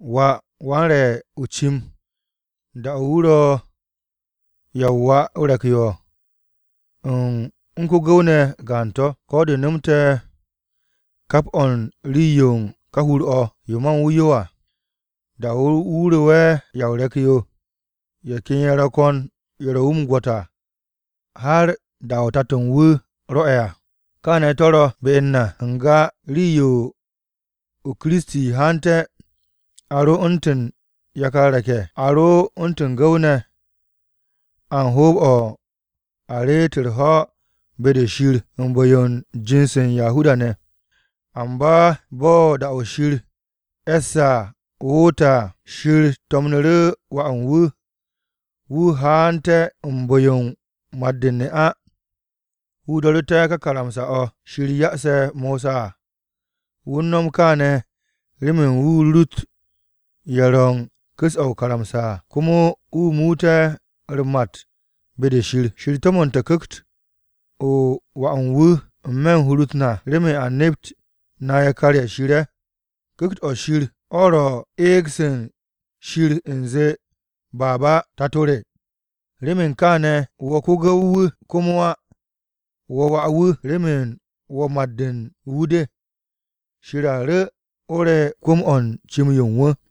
Wà wan-re̱ o-cim da-o̱ wu̱ ro ya o-wà o-re̱k yo, wu̱ u̱n ko-gu̱w ne̱ gaan to̱, ko̱ de nomte̱ kap o̱ u̱n rii-yo u̱n ka hur-o̱ yo ma u̱n wu̱ yo à. Da-o̱ wu̱ ro'e̱ ya o-re̱k yo, ye̱ ken ye̱ ro̱ ko̱n ye̱ ro̱ wu̱ o-gwo̱t à har da-o̱ tato-o̱ u̱n wu̱ rwo̱'e̱ à. Kaane̱ to̱ ro be u̱n na, n-ga rii-yo Kiristi haante̱, a ro u̱ntu̱n yakar re̱k-ye̱. A ro u̱ntu̱n gu̱w-ne̱, a u̱n hoob-o̱ u̱n a reet u̱r-ho̱ be-de Shir u̱n bu̱-yo u̱n jind-se u̱n Yahuda-ne̱. Amba bo̱ da-o̱ Shir e̱sse̱ à woote̱ à, Shir to̱mnu̱ru̱ Wà u̱n wu̱. Wu̱ haante̱ u̱n bu̱-yo u̱n mat-o̱ u̱n ne'a. Wu̱ do̱ru̱te̱ ka karamsa-o̱ Shir ya'ase̱ Mosa à. Wu̱ u̱n no̱m kaane̱ remen wu̱ rurut ye̱ ro̱ u̱n ku̱s-o̱ o-karamsa à, komo wu̱ muut ye̱ u̱r-mat be-de Shir. Shir to̱mo̱nte̱ Ku̱kt-o Wà u̱n wu̱ n-me̱ u̱n hur-u̱t na remen a nept na yakar-ye̱ Shir ye̱. Ku̱kt-o̱ Shir o̱ ro̱ u̱n eeg-se Shir u̱nze, “Abba, Tato re!” Remen kaane̱ wo̱ ko-gu̱w-wu̱ komo á, wo̱ wà-wu̱. Remen wo̱ mat-de u̱n wu̱ de, Shir a ru̱ o re̱ kwu̱m-o̱ u̱n cim-yo u̱n wu̱.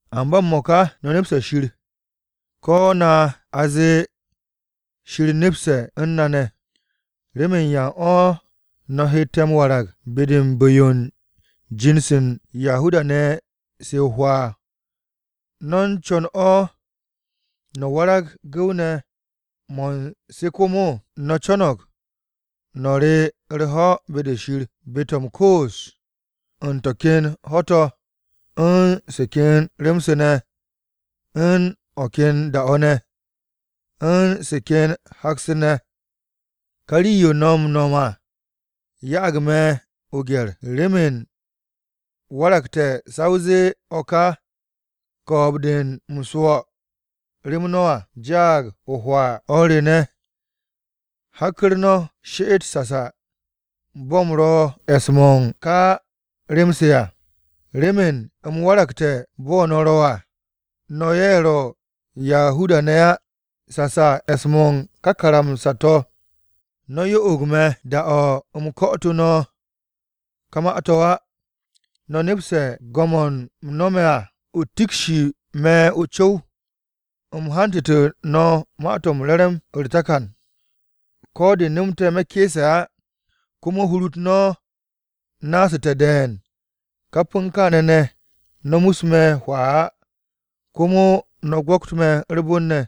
Amba m-mo̱ka no̱ nepse̱ Shir, ko̱ na a zee Shir nepse̱ u̱n no̱ ne̱. ¿Remen yan o̱ no̱ hette̱ m-warag be-de u̱n bu̱-yo u̱n jor-se u̱n Yahuda-ne̱ se o-hwaa? ¿No̱ u̱n co̱n o̱ no̱ warag gu̱w-mo̱ u̱n se komo? No̱ co̱no̱g no̱ re u̱r-ho̱ be-de Shir, be-to̱ m-koos u̱n to̱ ken ho̱-to̱ u̱n se ken re̱ng-se ne̱ u̱n o̱ ken da-o̱ ne̱, u̱n se ken hak-se ne̱. Ka rii-yo no̱ m-no̱m à ya'ag me̱ o-gye̱r, remen waragte̱ sa o zee o̱ ka ko̱o̱b-de u̱m swo̱ rem no̱ à jaag o-hwaa! O̱r re ne̱, hakku̱r no̱ she'et no̱ sasa bo̱ u̱m ro̱ e̱s-mo̱ u̱n ká rem-se à, remen u̱m waragte̱ bo̱ no̱ ro̱ à, (no̱ ye̱ ro̱ Yahuda-ne̱ á), sasa e̱s-mo̱ u̱n ká karamsa-to̱. No̱ yo'og me̱ da-o̱ u̱m ko̱'o̱tu̱ no̱ ka ma-to̱ á. No̱ nepse̱ go̱m-o̱ u̱m nome̱ à. O̱ tikshi me̱ co̱w-yo u̱m hantu̱tu̱ no̱ Ma-to̱ m-Re̱re̱m à u̱r-takan. Ko̱ de̱ nomte̱ me̱ ke̱e̱se̱ á komo hur-u̱t no̱ naasu̱te̱ de̱e̱n, kap u̱n kaane̱ ne̱, no̱ mus me̱ hwaa á. Komo no̱ gwo̱kt me̱ u̱r-bon ne̱.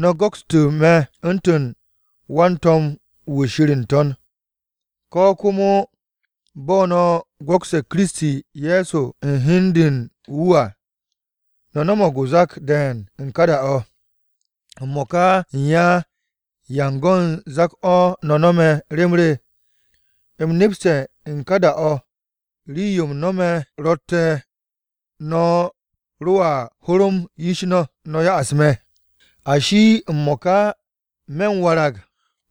No̱ go̱kstu̱ me̱ u̱ntu̱n wan-to̱m-wu̱ Shir n-To̱n, ko̱ komo bo̱ no̱ go̱kse̱ Kiristi Ye̱so u̱n hi u̱n de u̱n wu̱ à. No̱ no̱mo̱g o-zak de̱e̱n u̱n ka da-o̱! M-mo̱ka u̱n ya, ¿yan go̱n zak-o̱ no̱ no̱me̱ rem re? U̱m nepste̱ u̱n ka da-o̱, rii-yo m-nome̱ rotte̱, no̱ ro̱a hu̱ru̱m yish no̱, no̱ ya'as me̱! Ashi, ¿m-mo̱ka me̱ u̱n warag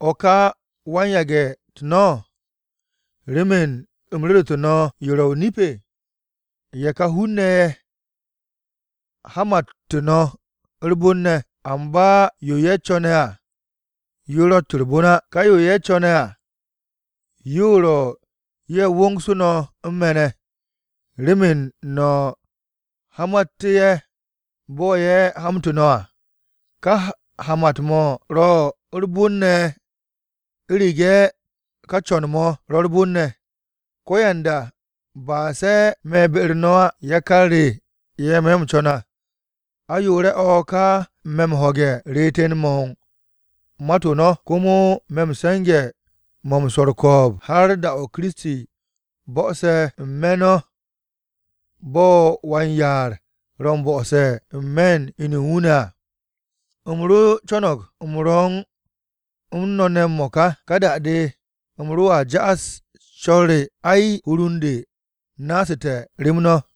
o̱ ka wan-yage̱-u̱t no̱, remen u̱m ru̱ru̱tu̱ no̱ yo ro̱ o-nip? Ye̱ ka hun-ne̱ ye̱ hamattu̱ no̱ u̱r-bon ne̱, amba yo ye̱ co̱ne̱ à yo ro̱tt u̱r-bon á. Ka yo ye̱ co̱ne̱ à yo ro̱ ye̱ wongsu̱ no̱ u̱n me̱ ne̱, remen no̱ hamattú̱ ye̱ bo̱ ye̱ hamtu̱ no̱ à. Ka hamat-mo̱ ro̱ u̱r-bon ne̱ u̱rege̱ ka co̱n-mo̱ ro̱ u̱r-bon ne̱, ko̱yanda, ba se̱ me̱ be-u̱r no̱ á. Yakar re ye̱ me̱ m-co̱n à, ayoore̱-o̱ ka me̱ m-ho̱ge̱ reeten-mo̱ u̱n mat-o no̱. Komo me̱ u̱n se̱nge̱-mo̱ u̱n swo̱r u̱r-ko̱o̱b har da-o̱ Kiristi bo̱'o̱se̱ n-me̱ no̱ bo̱ wan-yaar ro̱ m-bo̱'o̱se̱ u̱n me̱n-u̱t inu u̱n wu̱ à. U̱m ro co̱no̱g u̱m ro̱ u̱n no̱ ne̱ m-mo̱ka, ka da-de u̱m roa ja'as co̱r re. Ay, hur u̱n de naasu̱te̱ rem no̱!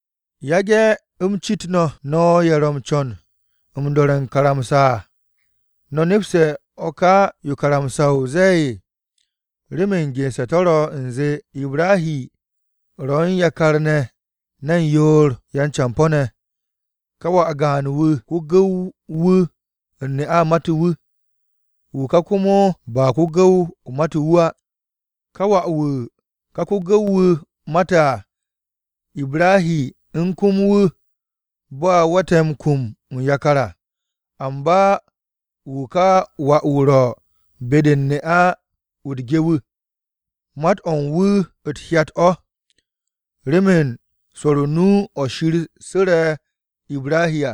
Yage̱ u̱m cit no̱, ¿no̱ ye̱ ro̱ m-co̱n m-do̱re̱ o-karamsa à, no̱ nepste̱ o̱ ka yo karamsa-o zee? Remen gense̱ to̱ ro̱ u̱nze, Ibrahi ro̱ u̱n yakar ne̱ ne̱n yoor yan-campo̱-ne̱, ka wà gaan-wu̱ ko-gu̱w-wu̱ u̱n ne'a matu̱ wu̱, wu̱ ka komo ba ko-gu̱w matu̱ wu̱ á. Ka wà-wu̱ ka ko-gu̱w-wu̱ mate̱ à, Ibrahi u̱n kum wu̱ bo̱ a we̱tte̱ m-kum u̱n yakar à. Amba wu̱ ka wà-wu̱ ro̱ be-de u̱n ne'a-wu̱ u̱t-ge à, mat-o̱ u̱n wu̱ o̱ u̱t-hyat o̱, remen swo̱r o-nu o̱ Shir su̱re̱ Ibrahi à.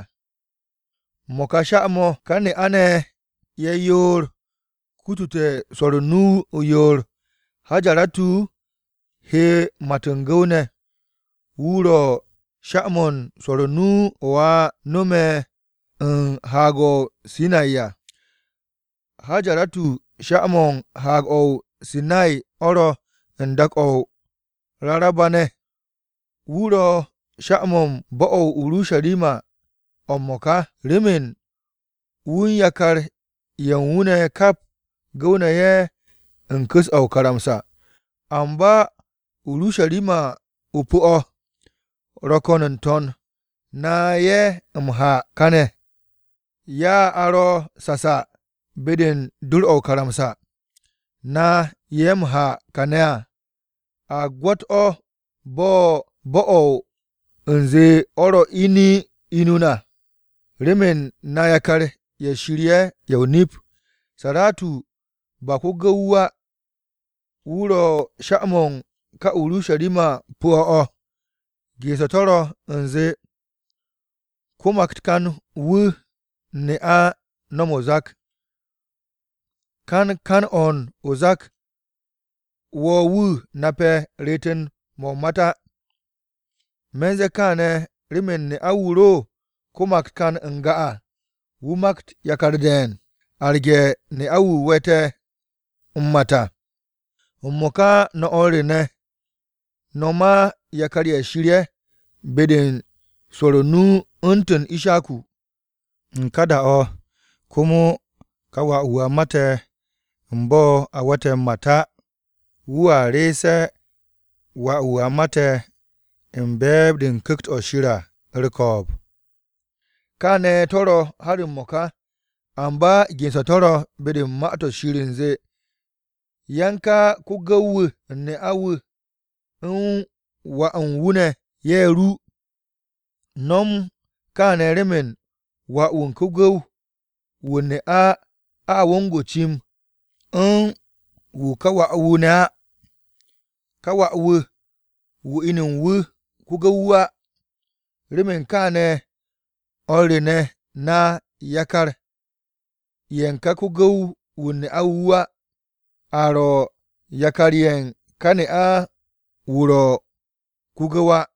Mo̱ ka sha-mo̱, ka ne'a-ne̱ ye̱ yoor kutute̱ swo̱r o-nu o-yoor. Hajaratu he mat u̱n gu̱w-ne̱, wu̱ ro̱ sha-mo̱ u̱n swo̱r o-nu o̱ a no̱me̱ u̱n Haag-o̱ Sinay à. Hajaratu sha-mo̱ u̱n Haag-o̱ o-Sinay o̱ ro̱ u̱n dak-o̱ u̱n Raraba-ne̱ à. Wu̱ ro̱ sha-mo̱ u̱n bo̱-o̱ o-Urusharima o̱ m-mo̱ka, remen wu̱ u̱n yakar-ye̱ u̱n wu̱ ne̱ kap gu̱w-ne̱ ye̱ u̱n ku̱s-o̱ o-karamsa. Amba Urusharima-o pu̱-o̱ ro̱ ko̱n n-to̱n, na ye̱ m-ha kane̱ à ya a ro̱ sasa be-de u̱n dor-o̱ o-karamsa. Na ye̱ m-ha kane̱ à, a o̱ u̱n gwo̱t-o̱ o-bo̱ u̱nze o̱ ro̱ inu na remen na yakar-ye̱ Shir ye̱ ye̱ o-nip. Saratu, ba ko-gu̱w-wu̱ á, wu̱ ro̱ sha-mo̱ u̱n ka Urusharima-o pu̱-o̱ o̱. Gense̱ to̱ ro̱ u̱nze, “Ko-maktan-wu̱ u̱n ne'a no̱m o-zak, kan kan-o̱ o-zak wo̱ wu̱ nape̱ reeten-mo̱ o-mat á. Me̱n ze̱e̱ kaane̱ remen ne'a, wu̱ ro ko-maktan n-ga à, wu̱ makt yakar de̱e̱n, arge̱ ne'a-wu̱ we̱tte̱ m-mat à.” M-mo̱ka no̱ o̱r re ne̱, no̱ ma yakar-ye̱ Shir ye̱ be-de u̱n swo̱r o-nu u̱ntu̱n Ishaku. U̱n ka da-o̱ komo ka wà-wu̱ a mate̱ u̱n bo̱ a we̱tte̱ m-mat á, wu̱a re̱e̱se̱ wà-wu̱ a mate̱ u̱n be̱e̱b-de u̱n Ku̱kt-o̱ Shir à u̱r-ko̱o̱b. Kaane̱ to̱ ro̱ har m-mo̱ka. Amba gense̱ to̱ ro̱ be-de u̱n Ma-to̱ Shir u̱nze, “Yan ka ko-gu̱w-wu̱ u̱n ne'a-wu̱ u̱n wà u̱n wu̱ ne̱, ye̱ ru. No̱m kaane̱ remen wà-wu̱ u̱n ko-gu̱w-wu̱ u̱n ne'a a wong o-cim u̱n wu̱ kà wà-wu̱ ne̱ á. Ká wà-wu̱ wu̱ inu u̱n wu̱ ro̱ ko-gu̱w á.” Remen kaane̱ o̱r re ne̱, na yakar-ye̱ u̱n ka ko-gu̱w ne'a-wu̱ wu̱ á. A ro̱ yakar-ye̱ u̱n ka ne'a-wu̱ wu̱ ro̱ ko-gu̱w á.